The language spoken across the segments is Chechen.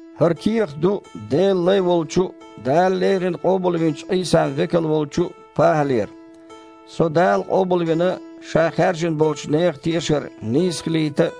ХІара кехат ду Делан лай волчу а, Дала леррина къобалвинчу Іийсан векал волчу а ПахІалера. Со Дала къобалвина Ша хаьржина болчу нехан тешар нийса хилийта а,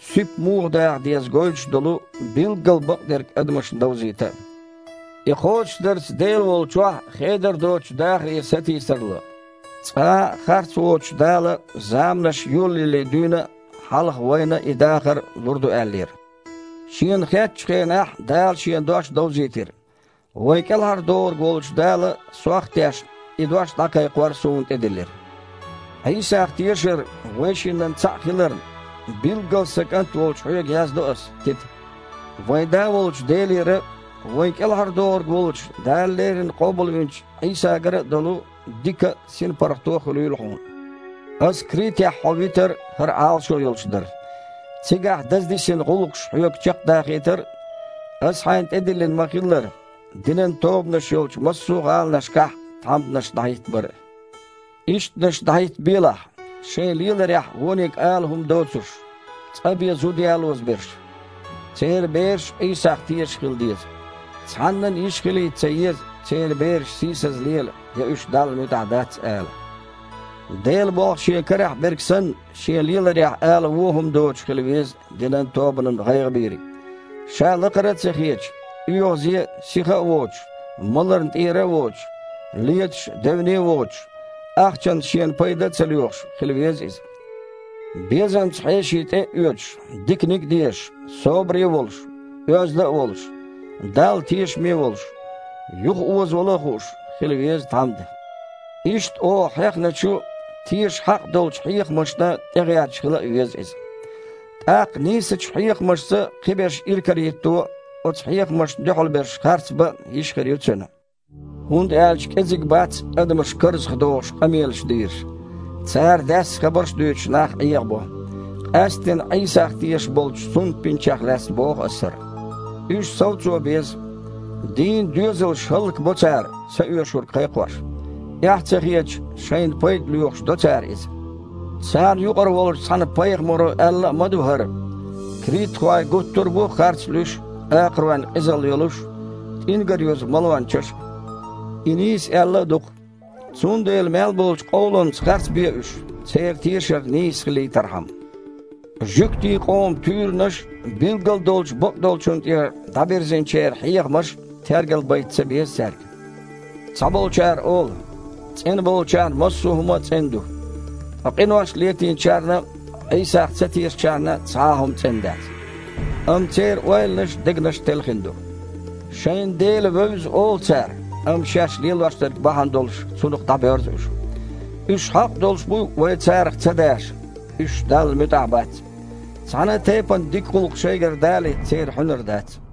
суьпа муха даха деза гойтуш долу билггал бакъдерг адамашна довзийта а. И кхочушдарца Дела волчохь хедар доцучу дахаре сатийсар ло. Цкъа а харц воцучу Дала заманаш йолаялале дуьйна а хьалха вайна и дахар лур ду аьллера. Шена хеттачу хенахь Дала Шен дош довзийтира. Вайн КІелхьардохург волчу Дала, сох а тешна, и дош дІакхайкхор суна тІедиллира. Іийсах тешар вайшиннан цхьаъ хиларна, билггал сан кІант волчу хьоьга яздо аса, Тита. Вайн Да волчу Делера а, вайн КІелхьардохург волчу Дала леррина къобалвинчу Іийсагара а долу дика а, синпаргІато а хуьлийла хьуна. Аса Критехь хьо витар хІара Іалашо йолуш дара: цигахь даза дисина гІуллакхаш хьоьга чекхдахийтар а, ас хьайна тІедиллина ма-хиллара, динан тобанаш йолчу массо а гІаланашкахь тхьамданаш дІахІиттабар а. Ишттанаш дІахІиттабелахь: шайн леларехь вониг ала хІума доцурш, цкъа бен зуда ялоза берш. Церан бераш а Іийсах тешаш хила деза. Цхьаннан а йиш хилийта ца еза, церан бераш сийсаза лела, я уьш Далла муьтІахь дац ала. Делан болх шен карахь берг санна, шен леларехь ала вон хІума доцуш хила веза динан тобанан гІайгІабийриг. Ша лакхара а ца хеташ, оьгІазе а, сиха а воцуш, маларна тІера а воцуш, леташ а, девне а воцуш, ахчанца шена пайда а ца лоьхуш, хила веза иза. Безамца хьеший тІе а оьцуш, диканиг а дезаш, собаре а волуш, оьзда а волуш, Далла тешаме а волуш, юхаозавала а хууш, хила веза тхьамда. Иштта оха хьехначу, теша хьакъ долчу хьехамашна тІегІерташ хила а веза иза. ТІаккха нийсачу хьехамашца кхиберш иракарахІитто а, оцу хьехамашна дуьхьал берш харцбан а йиш хир ю цуьнан. ХІунда аьлча кІезиг бац адамаш карзахдохуш къамелаш дийраш. Цара, даьсса хабарш а дуьйцуш, нах Іехабо. Къаьсттина Іийсах тешаш болчу сунтбинчех лаьцна боху ас хІара. Уьш совцо беза. Дийнна доьзалш хІаллакбо цара, цаоьшург кхайкхош. Эхь а ца хеташ, шайна пайда лоьхуш до цара иза. Царна юкъара волчу цхьана пайхамаро аьлла а ма ду хІара: «Критахой гуттара а бу харцлуьйш а, акхаройн къизалла йолуш а, тІингар юзу малончаш а». И нийса аьлла а ду-кх. Цундела мел болчу къовламца харцбе уьш, церан тешар нийса хилийтархьама. Жуьгтийн къоман туьйранаш а, билггал долчу бакъдолчун тІера дІабирзинчеран хьехамаш а тергал байта ца беза цаьрга. Цхьаболчара олу: «ЦІена болчарна массо а хІума цІена ду, ткъа къинош летийначарна а, Іийсах ца тешачарна а цхьа а хІума цІена дац». Амма церан ойланаш а, дегнаш а телхина ду. Шайна Дела вевза олу цара, амма шаьш лелош дерг бахьана долуш Цунах дІабоьрзу уьш. Уьш хьакъ долуш бу вай царах ца даша. Уьш Далла муьтІахь бац. Цхьана а тайпана дика гІуллакх шайгара далийта церан хьуьнар дац.